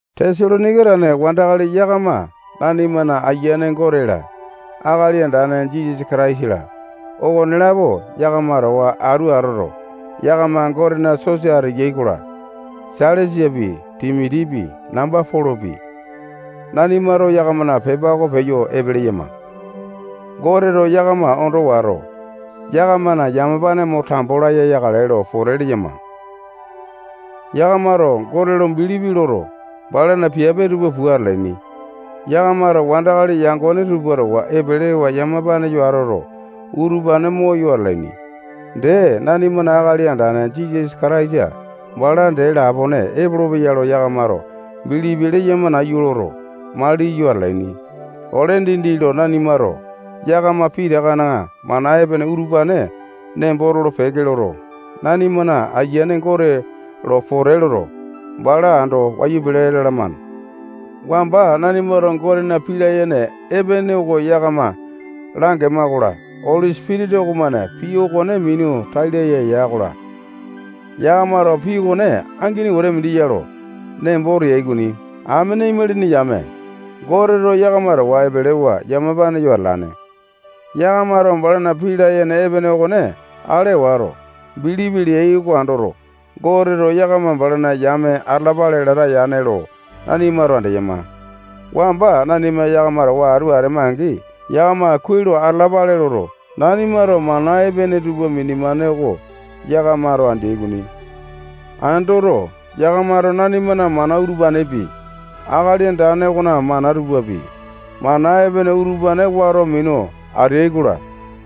Tesalonaika tane wandakali yakama nanimana Ayiane Gote-la, Akali Andane Jisasa Kataisa-la, okonelapo yakama towa atu atoto, yakama Gotena sosa ateyai-kola, Sailasapi, Timotipi, namba Polopi, nanimato yakamana pepa oko peyo epe leyama. Goteto yakama ondo wato, yakamana yamapane mo tambo laya yakale lo pote leyama. Yakamato Gote lo bilipi loto, balana piape tupa pua atalaini. Yakamato wandakali yangone tupa towa epelewa yamapa yo atoto, utupane moyo atalaini. Dee, nanimana Akali Andane Jisasa Kataisa bala dee lapone epolopeya lo yakamato bilipi leyama nayu loto, maliyo atalaini. Ole dindi lo nanimato yakama pitakana mana epene utupane nembo tolo-peke loto, nanimana Ayiane Gote lo pote loto, bala ando wayu pele lalamane. Wamba nanimato Gotena pii layene epene oko yakama langema-kola, Oli Sipitisa okomane pii okone minu tai laya ya-kola, yakamato pii okone angini wete mindi ya lo nembo teai okoni. Amene imalini yame, Goteto yakama towa epelewa yamapa yo atalane. Yakamato balana pii layene epene okone ale wato, bilipi leyai oko andoto, Goteto yakama balana yame atalapale lata yane ya lo nanimato andeyama. Wamba nanima yakama towa atu atema-angi, yakama kuai lo atalapale loto, nanimato mana epene tupa minema oko yakamato andeai okoni. Andoto, yakamato nanimana mana utupanepi, Akali Andane okona mana tupapi, mana epene utupane wato minu ateai-kola,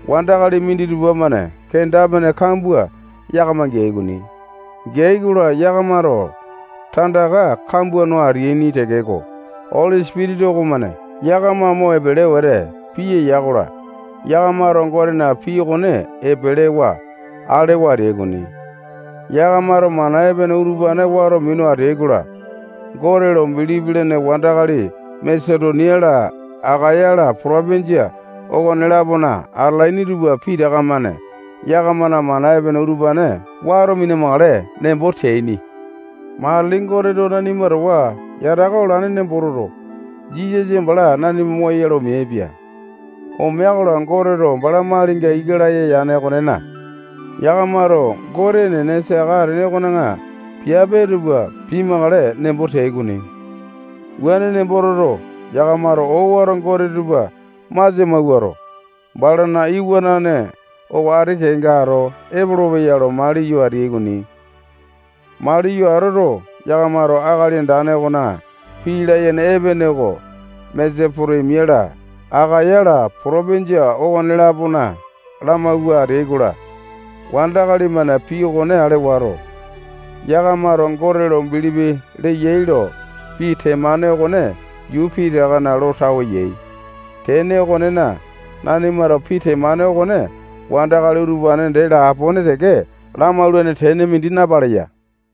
wandakali minditupa-mane kenda-pene kambua yakama geai okoni. Geai-kola, yakamato tandaka kambua no ateaini tekeko, Oli Sipitisa okomane yakama mo epele wete piya ya-kola, yakamato Gotena pii okone epelewa alewa ateai okoni. Yakamato mana epene utupane wato minu ateai-kola, Gote lo bilipi lene wandakali Masetonia-la, Akaya-la, potopinjia okone-lapona atalaini tupa pitaka-mane yakamana mana epene utupane wato mina-makale nembo teaini. Matili Goteto nanima towa yataka olane nembo toto, Jisasa bala nanima moyoyale omeaipia. Omea-kola, Goteto bala malinga ika laya yane okonena, yakamato Gote enene saka atene okona piape tupa pimakale nembo teai okoni. Wuane nembo toto, yakamato owato gote tupa masia mawuato, balana iwanane oko ati kenga ato epolopeya lo maliyo ateai okoni. Maliyo atoto, yakamato Akali Andane okona pii layene epene oko Masetonia-la, Akaya-la, potopinjia okone-lapona lamawua ateai-kola, wandakali-mane pii okone ale wato, yakamato Gote lo bilipi leyai lo pii temane okone yuu pitakana lo tawe yai. Tene okonena, nanimato pii temane okone wandakali utupane dee lapone teke lamaulane tene mindi napaleya.